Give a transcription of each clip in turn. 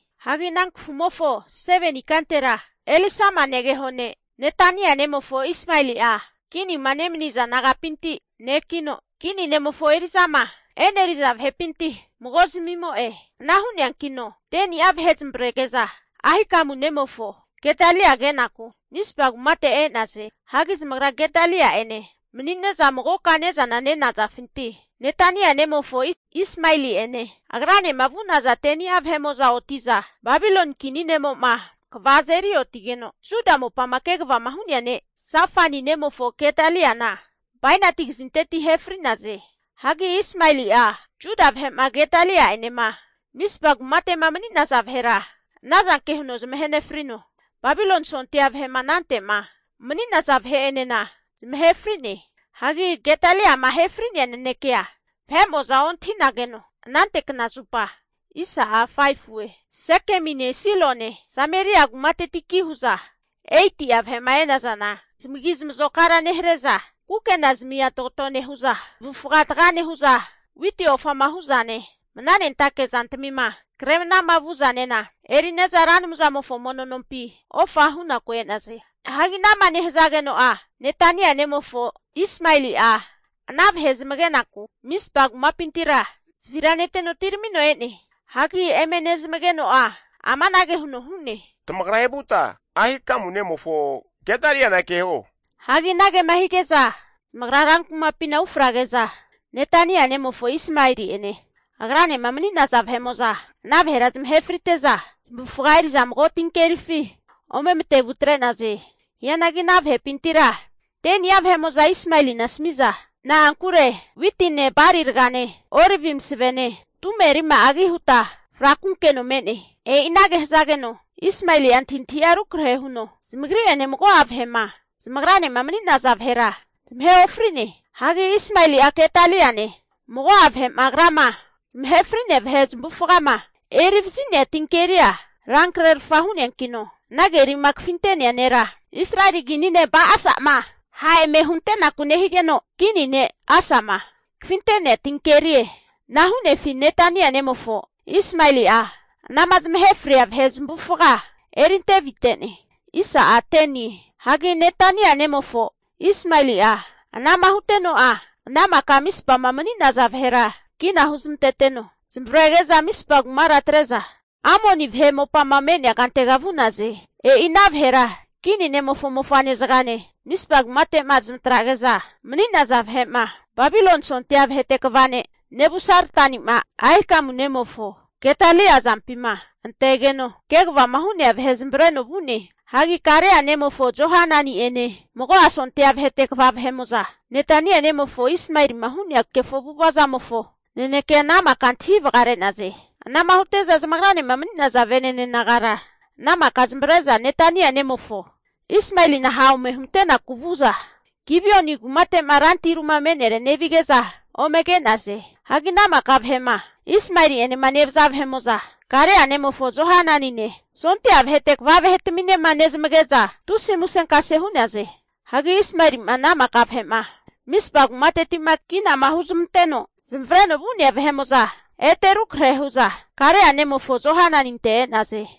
Hagi ana kafumofo 7ni ikantera, Elisama negeho ne' Netania nemofo Ismaeli'a, kinima nemaniza nagapinti nekino, kini ne'mofo eri'zama e'neriza vahepinti mago zamimo'e. Ana hu'neankino 10ni'a vahe zamavarege'za Ahikamu nemofo Gedalia kenaku Mizpa kumate e'naze. Hagi zamagra Gedalia'ene manine'za magoka ne'za nenazafinti, Netania nemofo Ismaeli'ene agranema vu'naza 10ni'a vahe'mo'za oti'za, Babiloni kini ne'mo'ma kva azeri otigeno Juda mopama kegavama hu'nea ne' Safani nemofo Gedaliana bainati kazinteti ahe fri'naze. Hagi Ismaeli'a Juda vahe'ma Gedalia'enema Mizpa kumate'ma mani'naza vahera anazanke huno zamahe nefrino, Babiloni sondia vahe'ma anante'ma mani'naza vahe'enena zamahe fri'ne. Hagi Gedaliama ahe fri'nea nanekea vahe'mo'za ontahi'nageno, anante kna zupa, Sekemine Silone Sameria kumatetiki hu'za, 80'a vahe'ma e'nazana, zamagi zamazokara nehare'za, kukena zamia tagato nehu'za, zamavufaga taga nehu'za, witi ofama hu'zane, mananentake zantamima kre manama vu'zanena eri'neza Ra Anumzamofo mono nompi ofa hunaku e'naze. Hagi ana'ma nehazageno'a Netania nemofo Ismaeli'a ana vahe zamagenaku Mizpa kumapintira zavira neteno atiramino e'ne. Hagi eme nezamageno'a amanage huno hu'ne, tamagra evuta Ahikamu nemofo Gedaliana keho. Hagi anagema hige'za zamagra rankumapima ufrage'za, Netania nemofo Ismaeli'ene agranema mani'naza vahe'mo'za ana vahera zamahe frite'za zamavufaga'a eri'za mago tinkerifi ome matevu atre'naze. Hianagi ana vahepintira 10ni'a vahe'mo'za Ismaelina asami'za, tagrira tahe ofrio, na'ankure witine bali ragane olivi masavene tume rima'agi huta frakunkeno me'ne. E'i anage hazageno Ismaeli'a antahintahi'a rukrahe huno zamagri'ene mago'a vahe'ma zamagranema mani'naza vahera zamahe ofri'ne. Hagi Ismaeli'a Gedali'ene mago'a vahe'ma agrama zamahe fri'nea vahe zamavufagama eri vazi'nea tinkeria rankrerfa hu'neankino ana kerima kafinte'nea nera, Israeli kini ne' Ba'asa'ma ha' eme huntenaku nehigeno, kini ne' Asa'ma kafinte'nea tinkerie. Ana hu'nefi Netania nemofo Ismaeli'a anama zamahe fria vahe zamavufaga erinte avite'ne. Hagi Netania nemofo Ismaeli'a ana'ma huteno'a ana maka Mizpama mani'naza vahera kina huzmanteteno zamavarege'za, Mizpa kumara atre'za Amoni vahe mopama me'nea kantega vu'naze. E'i ana vahera kini ne'mofo mofa'ne zagane, Mizpa kumate'ma zamatrage'za mani'naza vahe'ma, Babiloni Sondia vahete kva ne' Nebusaradani'ma Ahikamu nemofo Gedalia azampima antegeno, kegavama hu'nea vahe zamavareno vu'ne. Hagi Karea nemofo Johanani'ene mago'a sondia vahete kva vahe'mo'za, Netania nemofo Ismaeli'ma hu'nea kefo avu'ava zamofo nanekea ana maka antahi vagare'naze. Ana'ma hute'za zamagranema mani'naza vene'ne nagara ana maka zamavare'za Netania nemofo Ismaelina ha' ome huntenaku vu'za, Gibeoni kumate'ma rantiru'ma me'nere nevige'za ome ke'naze. Hagi ana maka vahe'ma Ismaeli'enema nevaza vahe'mo'za, Karea nemofo Johananine sondia vahete kva vahetaminema nezamage'za tusi musenkase hu'naze. Hagi Ismaeli'ma ana maka vahe'ma Mizpa kumateti'ma kinama huzamanteno zamavareno vu'nea vahe'mo'za, ete rukrahe hu'za Karea nemofo Johananinte e'naze.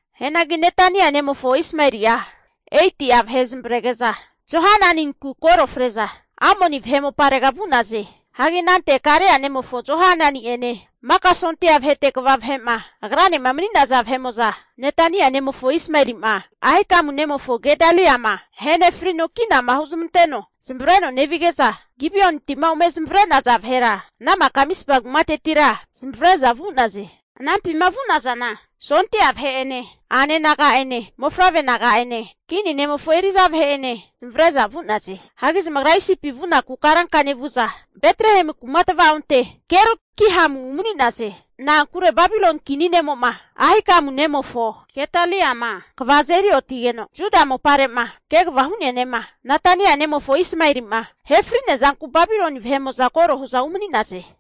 Hianagi Netania nemofo Ismaeli'a 8'a vahe zamavarege'za Johananinku koro fre'za Amoni vahe moparega vu'naze. Hagi anante Karea nemofo Johanani'ene maka sondia vahete kva vahe'ma agranema mani'naza vahe'mo'za, Netania nemofo Ismaeli'ma, Ahikamu nemofo Gedaliama ahenefrino kinama huzamanteno zamavareno nevige'za Gibeoniti'ma ome zamavare'naza vahera ana maka Mizpa kumatetira zamavare'za vu'naze. Anampima vu'nazana, sondia vahe'ene, a'nane naga'ene, mofavre naga'ene, kini nemofo eri'za vahe'enena zamavare'za vu'naze. Hagi zamagra Isipi vunaku karanka nevu'za, Betlehemu kuma tvaonte Gerut Kimham umani'naze. Na'ankure Babiloni kini ne'mo'ma Ahikamu nemofo Gedaliama kva azeri otigeno Juda mopare'ma kegavama hu'nea ne'ma, Netania nemofo Ismaeli'ma ahe fri'nea zanku Babiloni vahe koro hu'za umani'naze.